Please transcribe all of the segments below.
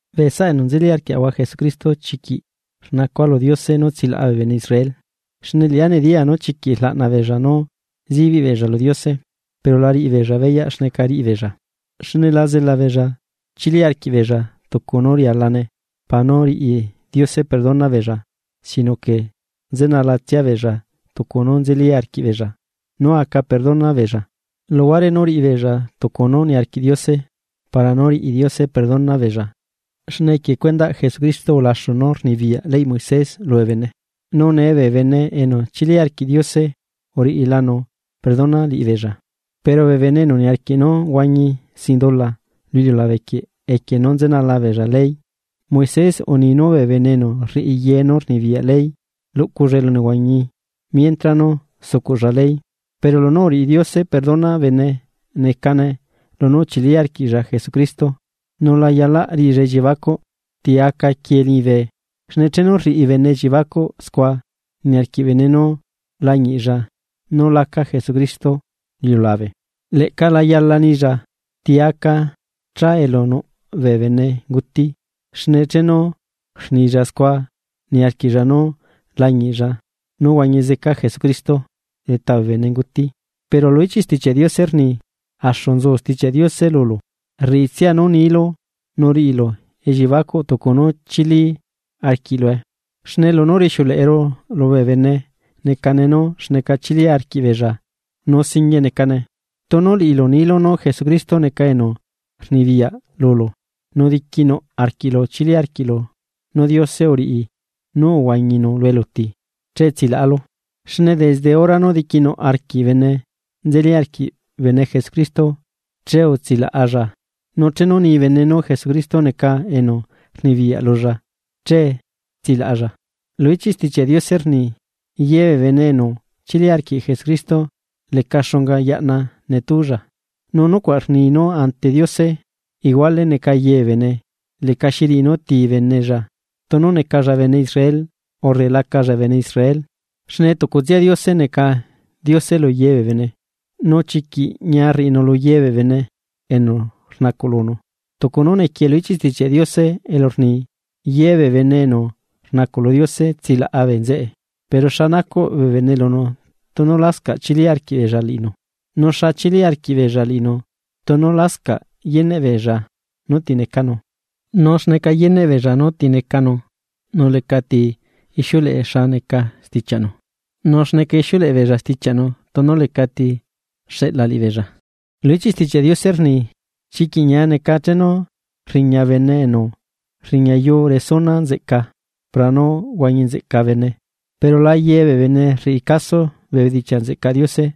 Bee saꞌa enu nzeli arquiaꞌahua Jesucristo, chiquiꞌ rnacua lu Diose nú tsilaꞌa bee bene Israel. Xne liꞌá nediyaa nú chiquiꞌ rlaꞌna beella nú zibiꞌ beella lu Diose. Pero la riꞌibeella beyaꞌ xneca riꞌibeella. Xne la zela beella chili arquiꞌbeella tucu nú rialane para nú riꞌi Diose perdona beella sino que nzenalatsia beella tucu nú nzeli arquiꞌbeella nú aca perdona beella, luhuare nú riꞌi beella tucu nú niarquiꞌ Diose para nú riꞌi Diose perdona beella. Xne equie cuendaꞌ Jesucristo ulaxu nú rnibiyaꞌ leyꞌ Moisés lubee bene, nu nee bee bene enu chili arquiꞌ Diose uriꞌilanu perdona liꞌibeella. Pero bee bene enu niarquiꞌ nú huañi sin dula lu iliulabequieꞌ equie nú nzenala beella leyꞌ Moisés unii nú bene enu rriꞌi ye nú rnibiyaꞌ ley luꞌculla elunehuañi mientra nú sucuꞌlla ley. Pero lunú uriꞌi Diose perdona bene necane lunú uchili arquiꞌlla Jesucristo nu la yalaꞌ riꞌilla elliebacuꞌ: “¿Ti aca quiee liñibe?” Xne chenu rriꞌi bene elliebacuꞌ scua niarquiꞌ bene nú lañiꞌlla nú laca Jesucristo lu iliulabe. “Leꞌca la yala nilla: ¿Ti aca cha elu nuꞌ bee benenguti?” Xne chenu rnilla scua niarquiꞌlla nú lañiꞌlla nú huañi zeca Jesucristo leta bee benenguti. Pero lu ichiꞌ Stichiaꞌ Diose rni: “Axu nzu Stichiaꞌ Diose lulu, rriꞌitsia nú niilu nu riꞌilu elliebacuꞌ tunu chili arquiꞌlue.” Xne lunú rixiuleꞌeru lubee bene necane nú xneca chili arquiꞌ beella, nu singuie necane. Tunu liꞌilu nilu nú Jesucristo neca enu rnibiyaꞌ lulu nu diquinuꞌ arquiꞌlu chili arquiꞌlu nú Diose uriꞌi nú uhuañinu lu eluti, che tsilaꞌalu. Xne desde hora nú diquiꞌnu arquiꞌ bene nzeli arquiꞌ bene Jesucristo che utsilaꞌalla. Nu chenu ni bene nú Jesucristo neca enu rnibiyaꞌ lulla che tsilaꞌalla. Lu ichiꞌ Stichiaꞌ Diose rni: “Ye bee bene enu chili arquiꞌ Jesucristo leca xunga yaꞌna netúlla.” Nu nucuaꞌ rni nú ante Diose iguale neca ye bee bene leca xiriꞌi nú ti benella, tunu necalla bene Israel urre lacalla bene Israel. Xne tucutsia Diose neca Diose lu ye bee bene, nu chiquiꞌ ñia rriꞌinu luye bee bene enu rnacuꞌ lunu. Tucu nú nequie lu ichiꞌ Stichiaꞌ Diose elu rni: “Yebee bene enu rnacuꞌ lu Diose tsilaꞌa bee nzeꞌe.” Pero, ¿xa nacuꞌ bene lunu tunu lascaꞌ chili arquiꞌbeella liꞌinu? ¿Nu xa chili arquiꞌ beella liꞌinu tunu lascaꞌ yeneꞌ beella nú ti necanu? ¿Nu xneca yeneꞌ beella nú ti necanu nu lecati ixiuleꞌe xa neca stichiaꞌnu? Nu, ¿xneca ixiuleꞌe beella stichiaꞌnu tunu lecati xeꞌla liꞌibeella? Lu ichiꞌ Stichiaꞌ Diose rni: “¡Chiquiꞌ ñia neca chenu rriña bene enu rriñayu resuna nzeꞌca para nú huañi nzeꞌca bee bene!” Pero la yebee bene rriꞌi caso bee bedichiaꞌ nzeꞌcaꞌ Diose,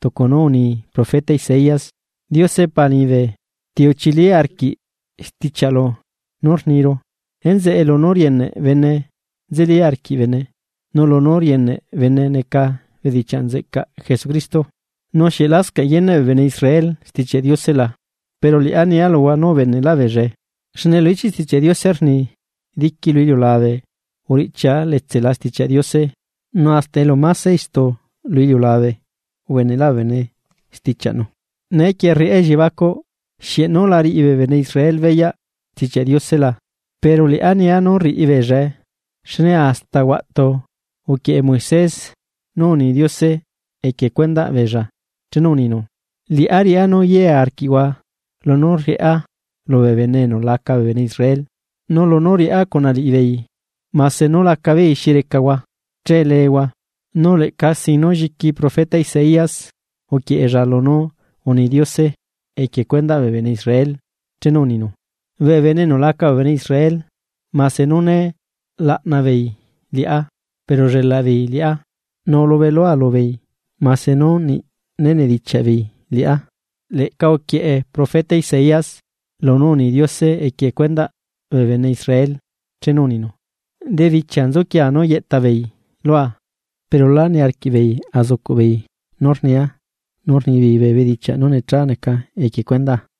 tucu nú uni profeta Isaías: “Diose Pa liñibe, ¿ti uchili arquiꞌ stichiaꞌlu nú rniru?” Enzeꞌe lunú rieneꞌ bene nzeli arquiꞌ bene, nu lunú rieneꞌ bene neca bedichiaꞌ nzeꞌcaꞌ Jesucristo. Nu, ¿xieꞌ lascaꞌ yeneꞌ bee bene Israel Stichiaꞌ Diose la? ¡Pero liꞌá nia luhua nú ubeneꞌlaꞌ beellae! Xne lu ichiꞌ Stichiaꞌ Diose rni: Diqui lu iliulabe uriꞌchia letsela Stichiaꞌ Diose, nu hasta elu máse istu lu iliulabe ubeneꞌlaꞌ bee bene stichiaꞌnu. Neequie rriꞌá elliebacuꞌ: ¿Xieꞌ nú la riꞌi bee bene Israel beyaꞌ Stichiaꞌ Diose la? Pero liꞌá nia nú rriꞌi beella beyaꞌe. Xne hasta huaꞌtu uquieꞌe Moisés nú uni Diose equie cuendaꞌ beella chenu uninu: Liꞌá riꞌá nú yiea arquiꞌhua lunú riꞌá lubee bene enu laca bee bene Israel, nu lunú riꞌá cuna liꞌibeei mase nú lacabeei xi recahua, che leehua. Nu leꞌca sin nú lliqui profeta Isaías uquieꞌella lunú uni Diose equie cuendaꞌ bee bene Israel chenu uninu: Bee bene enu laca bee bene Israel mase nú né laꞌnabeei liꞌá pero ullelaꞌbeei liꞌá. Nu ulubelua lubeei mase nú niꞌ né nedichiaꞌ beei liꞌá. Leꞌca uquieꞌe profeta Isaías lunú uni Diose equie cuendaꞌ bee bene Israel chenu uninu: “Debichia nzuquiea nú yeꞌtabeei lua, pero lá niarquiꞌbeei azucuꞌbeei nú rniaá nu rnibeei bee bedichiaꞌ nú necha neca equie cuendaa.”